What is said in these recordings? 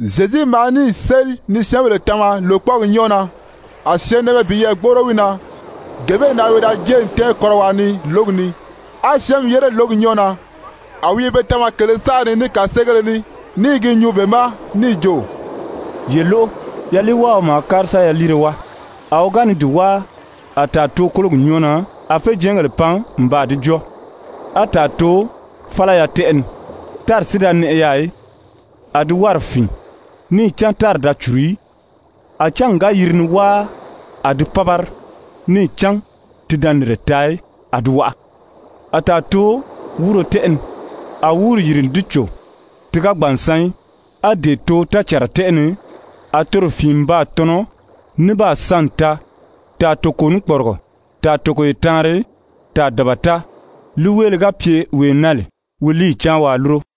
Zyezu maa níì séli ni syɛ́ɛnbèle tama lòkpɔɔgi nyɔ́ɔ na, a syɛɛnnɛʔɛmɛ piyɛɛ gbóʔoro wi na. Gee bee na wi da jée n tɛ́ɛn kɔ́rɔwaa ni lǒgi ni, á syɛ́ɛnmi yére lǒgi nyɔ́ɔ na. A wi i be tama kèlē saʔa ni ní kàseegéle ní, ní i gi nyuu be ma níì jo: «Ye lóʔo, yaliiwáaɔ maa kári sa yaliire wáa. A wi ga ni di wáa, a tàa too kólogi nyɔ́ɔ na, a féjɛɛngèle pan n baa di jɔ́ɔ. A tàa too fálaya tɛ́ʔɛ ni, tári si da nɛʔɛ yaà í. A di wárì fìin, níì cán tári da cùru í. A cángi ga yiri ni wáa, a di pábari, níì cán ti da nìnre taa í, a di waʔa. A tàa too wúuro tɛ́ʔɛ ni, a wúuri yìri n di cò, ti ga gbàn n san í. A dee too tácànra tɛ́ʔɛ ni, a toro fìin n baa tɔnɔ, ní baa san n taa, tàa toko ní kpɔrigɔ, tàa togoye taanri, tàa dabata. Líiweeloʔolo ga pye wee na lè wi líiyi cáan waa lúro.»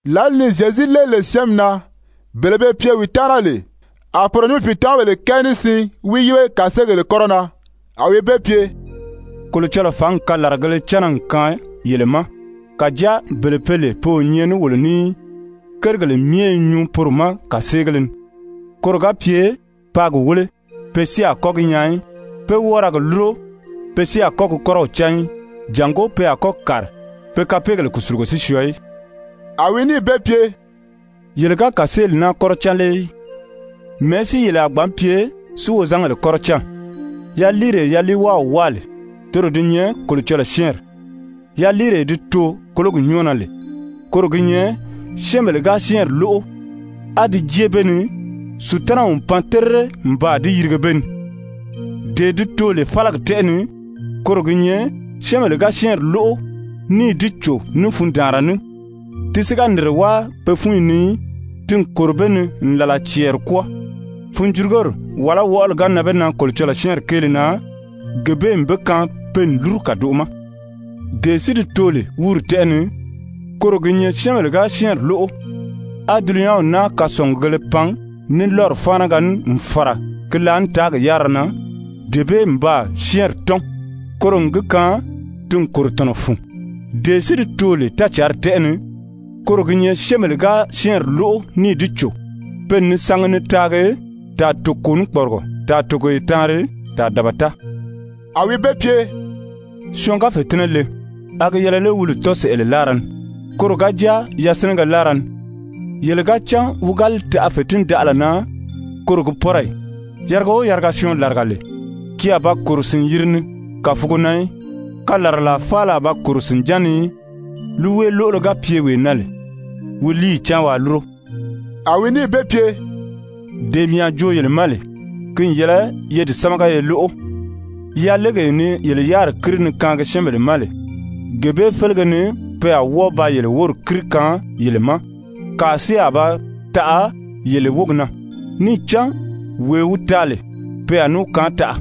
Lǎli ni Zyezu léeli lè syɛ́ɛnmi na, bele be pye wi taana lè, a poro ní wi pìitamabèle kɛɛ ní siin wi yíbe kàseegèle kɔ́rɔ na. A wi be pye: «Kolocɔlɔɔ fǎngi kalaragēle cánna n kaan yele ma, kàjáa bele be lè pe o nyɛ ní wolo ní í, kérigèle myɛ i nyuu poro ma kàseegéle ni. ‹Koro ga pye paa gi wéle, pe si a kɔ́ gi nyaa í. Pe wɔ́ɔ ra gi lúro, pe si a kɔ́ gi kɔ́rɔw cán í, jàngó pe a kɔ́ kàri, pe kapeegèle kùsulugo si syɔɔ í.›» A wi níì be pye: «Yele ga kàseeli naa kɔ́rɔ cán lé í? Mɛ̀ɛ́ si yele a gbǎn pye si wozangèle kɔ́rɔ cán? Yaliiree yaliiwáaw wáa lè, toro di nyɛ Kolocɔlɔɔ syɛ́ɛnri. Yaliiree di too kólogi nyɔ́ɔ na lè, koro gi nyɛ syɛ́ɛnbèle ga syɛ́ɛnri lóʔo, á di jée be ni, Sutanaw n pan terire n baa di yirige be ni. Dee di too lè fálagi tɛ́ʔɛ ni, koro gi nyɛ syɛ́ɛnbèle ga syɛ́ɛnri lóʔo níì di cò ní fundaanra ní, ti si ga nìnre wáa pe fúnyi ni í, ti n kòro be ni n làla cɛɛri kwɔ́ɔ. Funjurugori wàlá wɔʔɔli ga nan be na Kolocɔlɔɔ syɛ́ɛnri kéele na, gee bee n be kaan pe n lúru kàdoʔo ma. Dee si di too lè wúuri tɛ́ʔɛ ni, koro gi nyɛ syɛ́ɛnbèle ga syɛ́ɛnri lóʔo, á dulunyanw naa kasɔngugēle pan ní lɔ́ri fáanaga ní n fàra ki laànitaagi yárira na, dee bee n baa syɛ́ɛnri tɔ́n, koro n gi kaan ti n kòro tɔ̀nɔ fun. Dee si di too lè tácǎnri tɛ́ʔɛ ni, koro gi nyɛ syɛ́ɛnbèle ga syɛ́ɛnri lóʔo níì di cò, pe n ni sangi ni taagi, tàa toko ní kpɔrigɔ, tàa togoye taanri, tàa dabata.» A wi be pye: «Syɔɔn ga fètinnɛ le, a gi yɛlɛ lé wi li tɔ́n sɛ̀ʔɛlɛ láara ni, koro ga jáa yasinɛgɛ láara ni? Yele ga cán wi ga li taʔa fètindaʔala na, koro gi pɔ́rɔ ì? Yariga o yariga syɔɔn làriga lè, ki a ba kòro sìn-yiri ni kàfugo na í, kalaralaa faala a ba kòro sìnján ni í. Líiweeloʔolo ga pye wee na lè, wi líiyi cáan waa lúro.» A wi níì be pye: «Dee mii a joo yele ma lè, ki n yɛlɛ ye di sámaga ye lóʔo. Yalegee ni yele yáriri kíri ni kaangi syɛ́ɛnbèle ma lè, gee bee félege ni pe a wɔ́ɔ ba yele wóri kíri kaan yele ma, kàa si a ba taʔa yele wógi na. Níì cán wee wi taa lè, pe a ní wi kaan taʔa.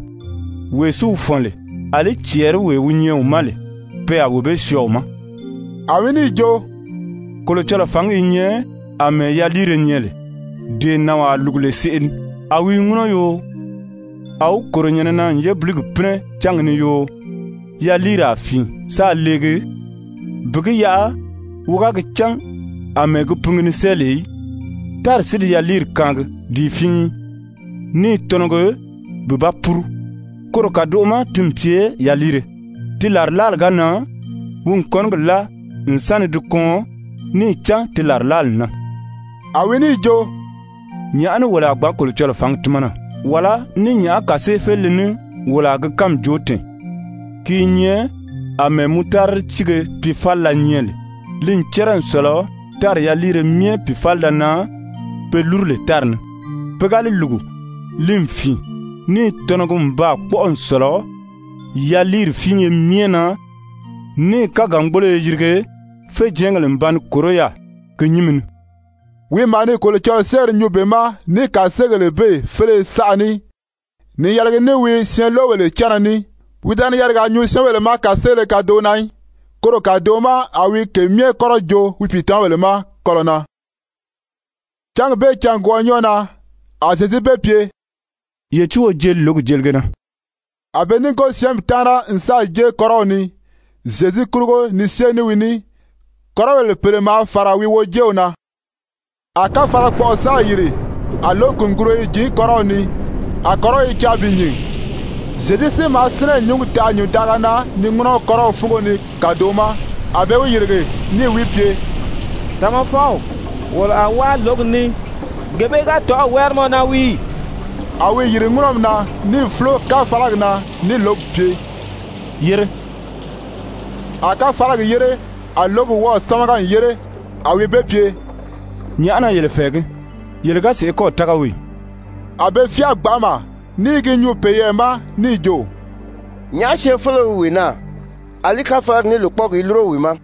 Wee si wi fɔ̀n lè, àlí cɛɛriwee wi nyɛ wi ma lè, pe a wee bee syɔɔ wi ma.» A wi níì jo: «Kolocɔlɔɔ fǎngi i nyɛ àmɛɛ yaliire nyɛ lè, dee nànwaa lùgu lè seʔe ni. A wi i ŋúnɔ yoo, a wi kòro nyɛ̀nɛ na n yébiligi pínɛ cángi ni yoo, yaliiri a fìin sáā leegi, bi gi yaʔa wi ga gi cán àmɛɛ gi pingi ni sée lè í. Tári si di yaliiri kaan di i fíin, ní i tɔnɔgi bi ba puru, koro kàdoʔo ma ti n pye yaliire. Ti làrilaali ga nan, wi n kɔ́nigi láa n sa ni di kɔɔn, níì cán di làrilaali n nan.» A wi níì jo: «Nyàʔá ní wolo a gbǎn Kolocɔlɔɔ fǎngi tímana, wàlá ní nyàʔá kàseefelile ní wolo a gi kánmi joo tɛ̀ɛn? Ki i nyɛ àmɛɛ mutaridi tíige piifalila nyɛ lè, li n cɛ́rɛ n sɔ̀lɔ tári yaliire myɛ pìifalida na pe lúru lè tári ni. Pe ga li lùgu, li n fìin, ní i tɔnɔgi n baa kpɔ́ʔɔ n sɔ̀lɔ yaliiri fíinye myɛ na, níì kágangboloyo yirige, féjɛɛngèle n ba ni kòró yaà ki nyínmi ni.» Wi maa ni Kolocɔlɔɔ syɛ́ɛnri nyuu be ma ní kàseegèle bee féleye saʔa ní ni yɛlɛgi ní wi syɛɛnloʔobèle cánna ní. Wi da ni yarigaa nyuu syɛ́ɛnbèle ma kàseele kadoʔo na í. Koro kàdoʔo ma a wi ke myɛ kɔ́rɔ joo wi pìitamabèle ma kɔlɔ̀ na. Cángi bee cângwɔʔɔ nyɔ́ɔ na, a Zyezu be pye: «Ye tíi wo jeli lǒgi jelige na.» A be núngo syɛ́ɛnmi taana n sáà jée kɔ́rɔw ni Zyezu kurugo ni syée ní wi ní, kɔ́rɔbèle pèle maa fàra wi wojeew na. A káfalakpɔʔɔ sáà yìri, a lǒgi kùnguruyo i jǐn kɔ́rɔw ni, a kɔ́rɔw i caa bi nyìn. Zyezu si maa sínɛ n nyǔngi taʔa nyùndaʔaga na ni ŋúnɔ kɔ́rɔw fúngo ni kàdoʔo ma. A be wi yìrige, níì wi pye: «Tamafɔw, wolo a wáa lǒgi ni, gee bee ga tɔ̀ʔɔ̂ wári mɔ na wii ì?» A wi yìri ŋúnɔmi na níì fúlo káfalagi na níì lǒgi pye: «Yére.» A káfalagi yére, a lǒgi wɔ́ɔ̀ sámaga n yére. A wi be pye: «Nyàʔá na yele fɛ̀ɛgí? Yele ga sèʔé kɔ́ɔ̀ tága wii ì?» A be fyáa gbanʔama ní i gi nyuu peyɛɛ ma níì jo: «Nyàʔá syɛɛnfeleo wi wee naa, àlí káfalagi ní lòkpɔɔgi i lúro wi ma?»